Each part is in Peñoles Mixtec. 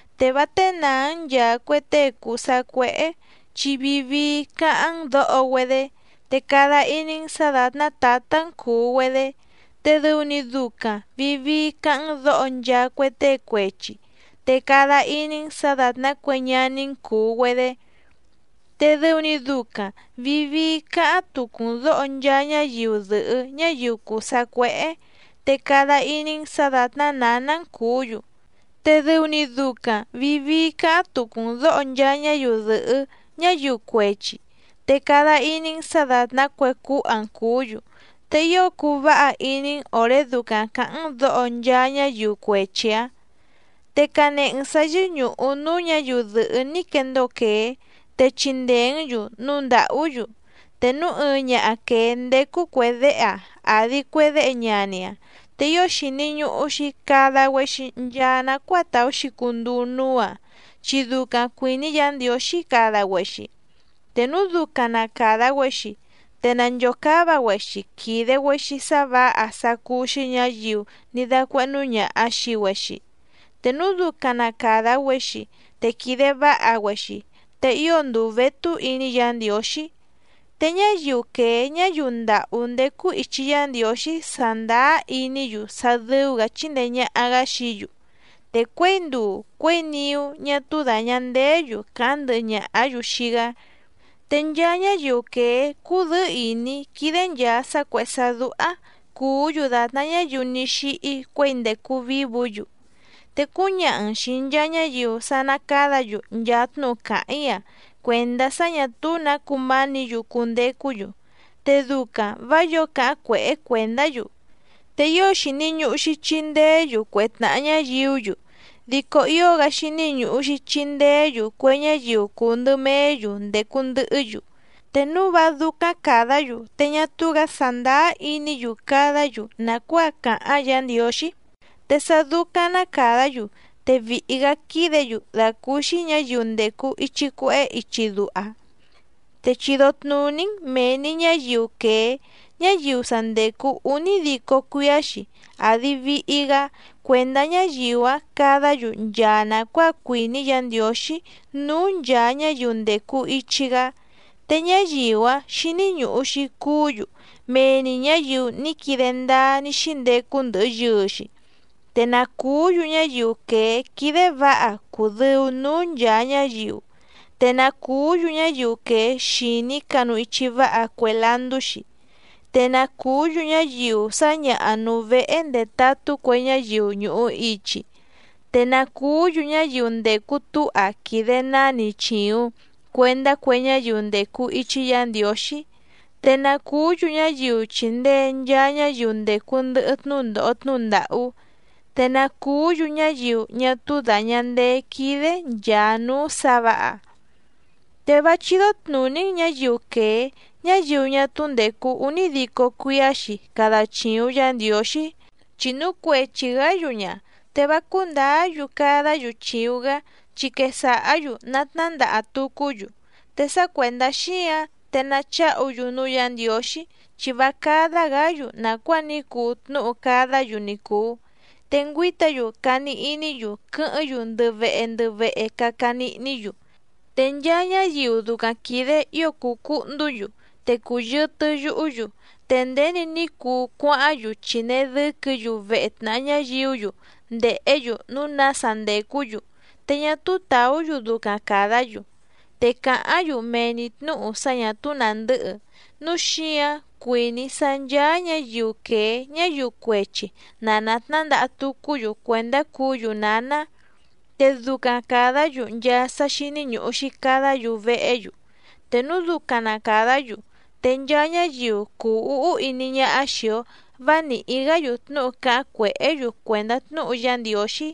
Te vá ténàá‑n nchàa cue tée cùu sacuéhé chi vii vii cáháⁿ‑n dǒho‑güedé, te cada iní‑n sǎ dàtná tǎtá‑n cùu‑güedé, te dɨu‑ni ducaⁿ vìi vii cáháⁿ‑n dǒho nchaa cue tée cuechi, te cada iní‑n sǎ dàtná cue ñaní‑n cùu‑güedé. Te dɨu‑ni ducaⁿ vìi vii cáháⁿ tucu‑n dǒho nchaa ñáyiu dɨ̀hɨ́ ñáyiu cùu sacuéhé, te cada iní‑n sǎ dàtná nǎná‑n cùú‑yu, te dɨu‑ni ducaⁿ vìi vii cáháⁿ tucu‑n dǒho nchaa ñáyiu dɨ̀hɨ́ ñáyiu cuechi, te cada iní‑n sǎ dàtná cue cúha‑n cùú‑yu, te ío cuu váha iní‑n òré ducaⁿ cǎháⁿ‑n dǒho nchaa ñáyiu cuechi‑ǎⁿ. Te canehe‑n sǎ yɨ́ñùhu núú ñǎyiu dɨ̀hɨ́ ní quendóo quèé, te chindèé‑n‑yu núu ndàhú‑yu. Te núu ɨɨⁿ ñaha quèé ndécú cuè déhe‑aⁿ àdi cue déhe ñani‑aⁿ, te ío xìni ñuhu‑xi cada‑güexi nchaa nacuáa tàú‑xi cunduu núú‑aⁿ chi ducaⁿ cuìní Yǎ Ndiǒxí cada‑güexi. Te núu ducaⁿ na càda‑güexi te nànchocáva‑güexi quìde‑güexi sá vǎha sá cúú‑xí ñǎyiu ní dácuéhnú ñàha xii‑güexi. Te núu ducaⁿ na càda‑güexi te quìde váha‑güexi te ío nduu vétú iní Yǎ Ndiǒxí. Te ñáyiu quèé ñáyiu ndàhú ndécú ìchi Yá Ndiǒxí sàndáá iní‑yu sá dɨ́ú‑gǎ chíndèe ñaha‑gá xií‑yu, te cuěi nduu cuěi niú ñá túú dàña ndeé‑yu càháⁿ ndɨhɨ ñàhá‑yu xii‑gá. Te nchaa ñáyiu quèé cúdɨ̌ɨ́ ìní quídé nchàa sá cuèhé sá dúhá cùú‑yu dàtná ñáyiu ní xíhí cuěi ndècu vívǔ‑yu. Te cúñaha‑n xìi nchaa ñáyiu sá ná cádǎ‑yu nchaa tnúhu càháⁿ‑í‑a cuèndá sá ñà túú nǎ cumánǐ‑yu cundecú‑yu, te ducaⁿ vǎ yǒo cáháⁿ cuèhé cuèndá‑yu. Te ío xìni ñuhu‑xi chindeé‑yu cue tnàha ñáyiú‑yu, dico ío‑gá xíní ñùhu‑xi chindeé‑yu cue ñáyiu cùu ndɨ meé‑yu ndècu ndɨhɨ́‑yu, te núu vá dúcáⁿ càdá‑yu te ñá túú‑gǎ sàndáá iní‑yu cadá‑yu nàcuáa càháⁿ Yǎ Ndiǒxí. Te sá dúcáⁿ ná càdá‑yu te vìhi‑gá quídě‑yu dàcúúxí ñǎyiu ndècu ichi cuehé ichi duha. Te chido tnùní‑n mèe‑ni ñáyiu quèé ñáyiu sa ndècu únídico cuíá‑xi àdi vihi‑gá cuèndá ñáyiu‑áⁿ cadá‑yu nchaa nàcuáa cuìní Yǎ Ndiǒxí núú nchàa ñáyiu ndècu ichi‑gá, te ñáyiu‑áⁿ xíní ñùhu‑xi cuú‑yu mee‑ni ñǎyiu ní quide ndáá ní xíndecu ndɨhɨ yɨɨ‑xi. Te na cùú‑yu ñáyiu quèé quídé vǎha cùdɨu núú nchàa ñáyiu, te na cùú‑yu ñáyiu quèé xìní canu ichi váha cue landú‑xi, te na cùú‑yu ñáyiu sǎñaha nùu vehe ndetatú cue ñáyiu ñùhu ichi, te na cùú‑yu ñáyiu ndècu túha quìde náni chìuⁿ cuendá cue ñáyiu ndècu ichi Yá Ndiǒxí, te na cùú‑yu ñáyiu chìndee nchaa ñáyiu ndècu ndɨhɨ tnúndòho tnúhu ndàhú, te na cùú‑yu ñáyiu ñá túú dàña ndeé quídé nchàa núú sǎ vǎha. Te vá chídó tnùní‑n ñǎyiu quèé ñáyiu ñá túú ndècu únídico cuíá‑xi cada chìuⁿ Yá Ndiǒxí, chi núu cuechi‑gǎ‑yu ña, te vá cúndǎá‑yu cadá‑yu chìuⁿ‑gá, chi quesàhá‑yu natnándaha tucú‑yu. Te sá cuèndá xíǎⁿ te nacháhu‑yu núú Yǎ Ndiǒxí, chi vá cádá‑gǎ‑yu nàcuáa ní cuu tnúhu cadá‑yu ni cùu. Te ngüíta‑yu cani iní‑yu quɨ́hɨ́ⁿ‑yu ndɨ vehe ndɨ vehe caca nihní‑yu, te nchaa ñáyiu ducaⁿ quìde ío cùu cuhndú‑yu, te cùyɨtɨ yuhú‑yu, te nděni ní cuu cuáháⁿ‑yu chìnee dɨ́quɨ̌‑yu vehe tnàha ñáyiú‑yu ndèhé‑yu núu nása ndècú‑yu, te ñá túú tàú‑yu ducaⁿ càdá‑yu, te càháⁿ‑yu mee‑ni tnǔhu sá ñà túú nàndɨ́hɨ. Núu xíǎⁿ cuìní‑í sá ncháá ñǎyiu quèé ñáyiu cuechi na nàtnándaha tucú‑yu cuèndá cuú‑yu nǎná, te ducaⁿ càdá‑yu nchaa sá xíní ñùhu‑xi cadá‑yu vehé‑yu, te núu ducaⁿ na càdá‑yu, te nchaa ñáyiu cùu úhú iní ñáhá xìi‑o vá nìhí‑gá‑yu tnúhu cáháⁿ cuèhé‑yu cuèndá tnúhu Yá Ndiǒxí.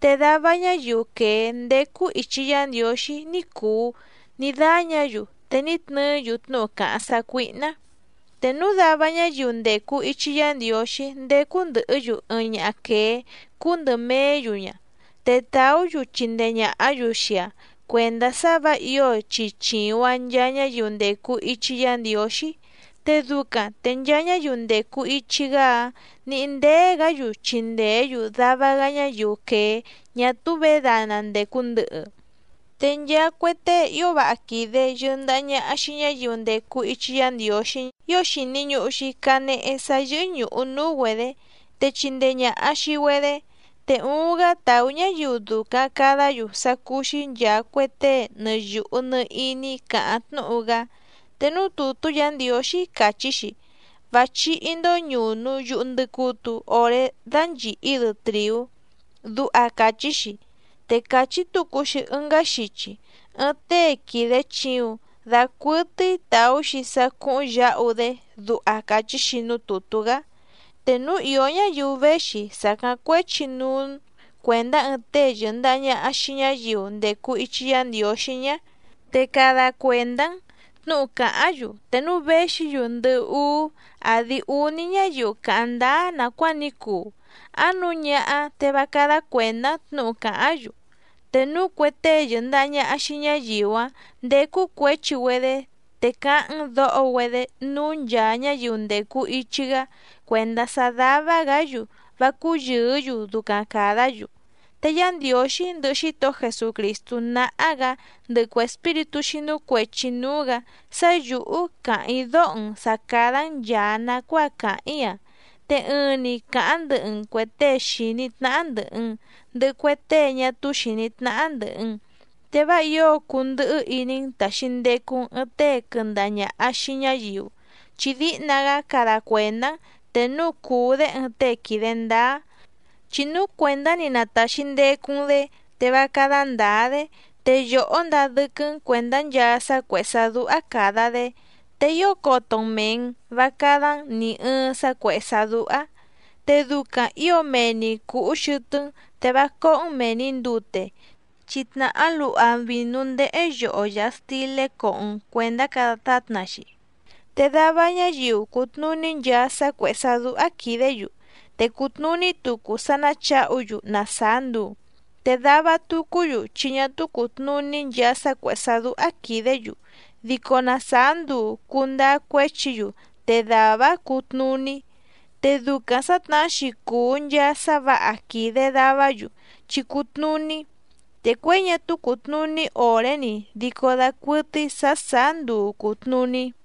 Te dava ñáyiu quèé ndécú ìchi Yá Ndiǒxí ní cùu ní dáñǎ‑yu te ní tnɨɨ́‑yu tnúhu càháⁿ sácuíhná. Te núu dava ñáyiu ndècu ichi Yá Ndiǒxí ndécú ndɨ̀hɨ́‑yu ɨɨⁿ ñaha quèé cúú ndɨ̀ meé‑yu ña, te tàú‑yu chindee ñàhá‑yu xii‑aⁿ cuèndá sá vǎ ǐo chi chìuⁿ‑aⁿ nchaa ñáyiu ndècu ichi Yá Ndiǒxí, te ducaⁿ te nchaa ñáyiu ndècu ichi‑gá‑áⁿ nǐhí ndéé‑gǎ‑yu chindèé‑yu dava‑gá ñáyiu quèé ñá túú vědana ndècu ndɨhɨ. Te nchaa cue tée ío váha quìde yɨndaha ñaha xii ñáyiu ndècu ichi Yá Ndiǒxí ío xìni ñuhu‑xi canehe sá yɨ́hɨ́ ñùhu núú‑güedě, te chindee ñàha xii‑güedé. Te uuⁿ‑gá tàú ñáyiu ducaⁿ càdá‑yu sá cúú‑xí nchàa cue tée nɨ yùhu nɨ iní càháⁿ tnúhu‑gá. Te núú tùtú Yǎ Ndiǒxí càchí‑xi: “Vá chíhí‑ndó ñùnu yuhu ndɨcutu oré dánchìhí‑dɨ trìú”, duha càchí‑xi. Te càchí tucu‑xi ɨngá xichi: “Ɨɨⁿ tée quìde chiuⁿ dacuɨtɨ́í tàú‑xi sá cúhúⁿ yǎhu‑dé”, duha càchí‑xi núú tùtú‑gá. Te núu ìó ñáyiu véxi sàcáⁿ cuéchi núú‑n cuèndá ɨɨⁿ tée yɨ̀ndaha ñaha xii ñáyiu ndècu ichi Yá Ndiǒxí ñá, te cada cuèndá‑n tnǔhu càháⁿ‑yu te núu véxi‑yu ndɨhɨ úú àdi úní ñáyiu càháⁿ ndáá nàcuáa ní cuu, áⁿ nǔu ñáhá te vá cádá cuèndá‑n tnǔhu càháⁿ‑yu. Te núu cue tée yɨ̀ndaha ñaha xii ñáyiu‑áⁿ ndécú cuěchi‑güedé, te cáháⁿ‑n dǒho‑güedé núú nchàa ñáyiu ndècu ichi‑gá cuèndá sá dává‑gǎ‑yu vá cúyɨ̀ɨ́‑yu ducaⁿ càdá‑yu. Te Yá Ndiǒxí ndɨhɨ Xítohó Jesucrìstú náhá‑gǎ ndɨhɨ cue espíritú xínú cuèchi núú‑gǎ sá yǔhú càháⁿ‑í dóho‑n sǎ cádá‑n nchàa nacuáa càháⁿ‑í‑a, te ɨɨⁿ‑ni cǎháⁿ ndɨhɨ‑n cuè tée xìní tnáhá ndɨ̀hɨ‑n, ndɨhɨ cue tée ñá túú xìní tnáhá ndɨ̀hɨ‑n. Te vá ǐo cundɨhɨ́ iní‑n tàxi ndecu‑n ɨɨⁿ tée quɨndaha ñàha xii ñáyiu, chi díhna‑gá cada cuèndá‑n te núu cùu‑dé ɨɨⁿ tée quìde ndáá, chi núu cuèndá‑ni na tàxi ndecu‑n‑dé te vá cádá ndǎá‑dé, te yòhó ndaa dɨ́quɨ́‑n cuèndá nchaa sá cuèhé sá dúhá càda‑dé, te ío coto‑n mèe‑n vá cádá‑n nì ɨɨⁿ sá cuèhé sá dúhá. Te ducaⁿ ǐo mee‑ni cùhú xɨtɨ́‑n te vá cóhó‑n mèe‑ni ndute, chi tnàhá luha vìnú ndéhé yoho yàha stilé coho‑n cuèndá cada tátna‑xi. Te dava ñáyiu cùtnuní nchaa sá cuèhé sá dúhá quìdé‑yu, te cùtnuní tucu sá náchǎhu‑yu na sàá nduu, te dava tucú‑yu chi ñá túú cùtnuní nchaa sá cuèhé sá dúhá quìdé‑yu, dico na sàá nduu cùndáá cuéchi‑yu te dàvá‑áⁿ cutnùní. Te ducaⁿ sǎtnahá‑xi cùu nchaa sá vǎha quìde davá‑yu chi cùtnuní, te cuěi ñá túú cùtnuní òré‑ni dico dacuɨtɨ́í sǎ sàá nduu cùtnuní.